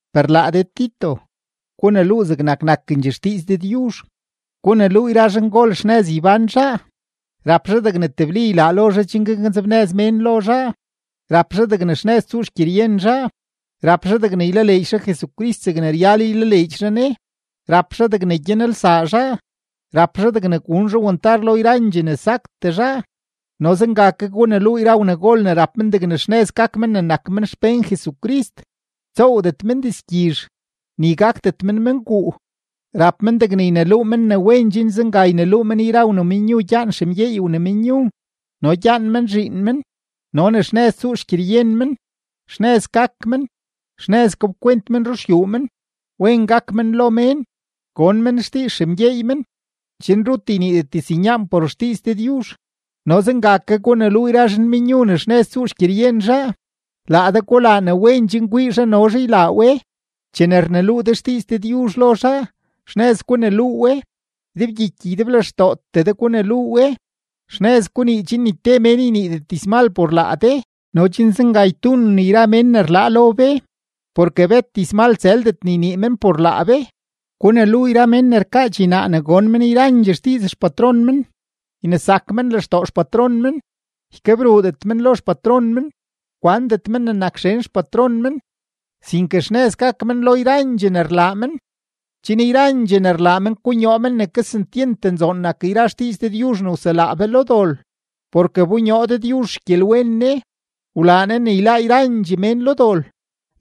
Per laa de Tito, guneluu zegnak nakendxee xdiiz Dëdyuzh. Guneluu yra zhangol xnëz ybán zhaa, rap zhaa degne tebli ylaa lo zhaa chen gaknzebnëz mén lo zhaa, rap zhaa degne xnëz tsuu xgyeryen zhaa, rap zhaa degne ylaleedx zhaa Jesucrist zegne ryal ylaleedx zhaa Ne, rap zhaa degne gyanelsaa zhaa, rap zhaa degne gun zhaa wantar lo yra ne saktee zhaa. No zenga ke guneluu yra wnagol ne rap men degne xnëz gak men ne nak men xpén Jesucrist, ytsoowdet men dizgyizh, ni gakdet men menguu; rap men degne yneluu men ne wen chen zenga yneluu men yra wnamenyu gyaan xemgyeey wnamenyu no gyaan men zhiin men, no ne xnëz tsuu xgyeryen men, xnëz gak men, xnëz gapkwent men ruxyuu men, wen gak men lo mén, gon men xdiiz xemgyeey men, chen rut yniidet diznyaan por xdiiz Dëdyuzh. No zenga ke guneluu yra zhanmenyu ne xnëz tsuu xgyeryen zhaa. Laa de gulaa ne wen chen kwii zhaa no zhaa ylaa we. Chene rneluu de xdiiz Dëdyuzh lo zhaa, xnëz guneluu we, ydebgyiky ydeblextootee de guneluu we, xnëz gunii, chen ni te mén yniidet dizmal por laa de no chen zenga ytuunen yra mén ne rlaa lo be, porke bet dizmal tsëldet ne ynii men por laa be. Guneluu yra men ne rkaa dxinaa ne gon men yrandxee xdiiz xpatron men, ynesak men lextoo xpatron men, ykebruudet men lo xpatron men. Kwandet men ne nak xen xpatron men, sinke xnëz gak men lo yrandxee ne rlaa men, chen yrandxee ne rlaa men konyoo men ne kesentyent nzoon nak yra xdiiz Dëdyuzh ne wselaa be lo dol. Porke wbonyoo Dëdyuzh xgyelwen Ne, wlaa Ne ne yláá yrandxee mén lo dol.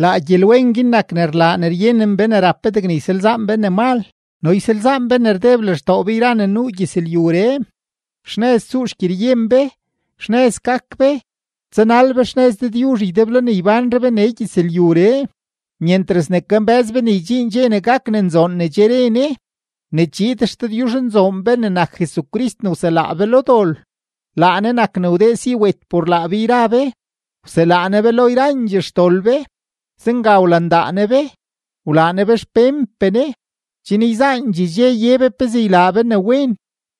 Laa gyelwen guin nak ne rlaa ne ryenen be ne rap be degne ysalzaan be ne mal no ysalzaan be ne rdeb lextoo be yra ne nuu gyëzlyuree, xnëz tsuu xgyeryen be, xnëz gak be, tsanal be xnëz Dëdyuzh ydeblo ne ybánre be nee gyëzlyuree, myentras ne kambë́z be ne ydxiin dxe ne gak ne nzoon ne che re Ne: ne chiid XDëdyuzhnzoon be ne nak Jesucrist ne wselaa be lo dol. Laa Ne nak ne wdee si wet por laa be yra be, wselaa Ne be lo yrandxee xdol be; zenga wlandaa Ne be, wlaa Ne be xpénpee Ne, chen yzaandxee dxe ye be pezee ylaa be ne wen.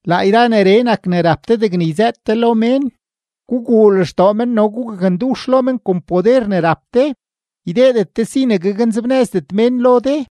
Laa yra neree nak ne rap de degne yzëët de lo mén. Guguu lextoo men no gugakndux lo men kon poder ne rap de. Ydeedet de si ne gaknzebnëzdet mén lo de.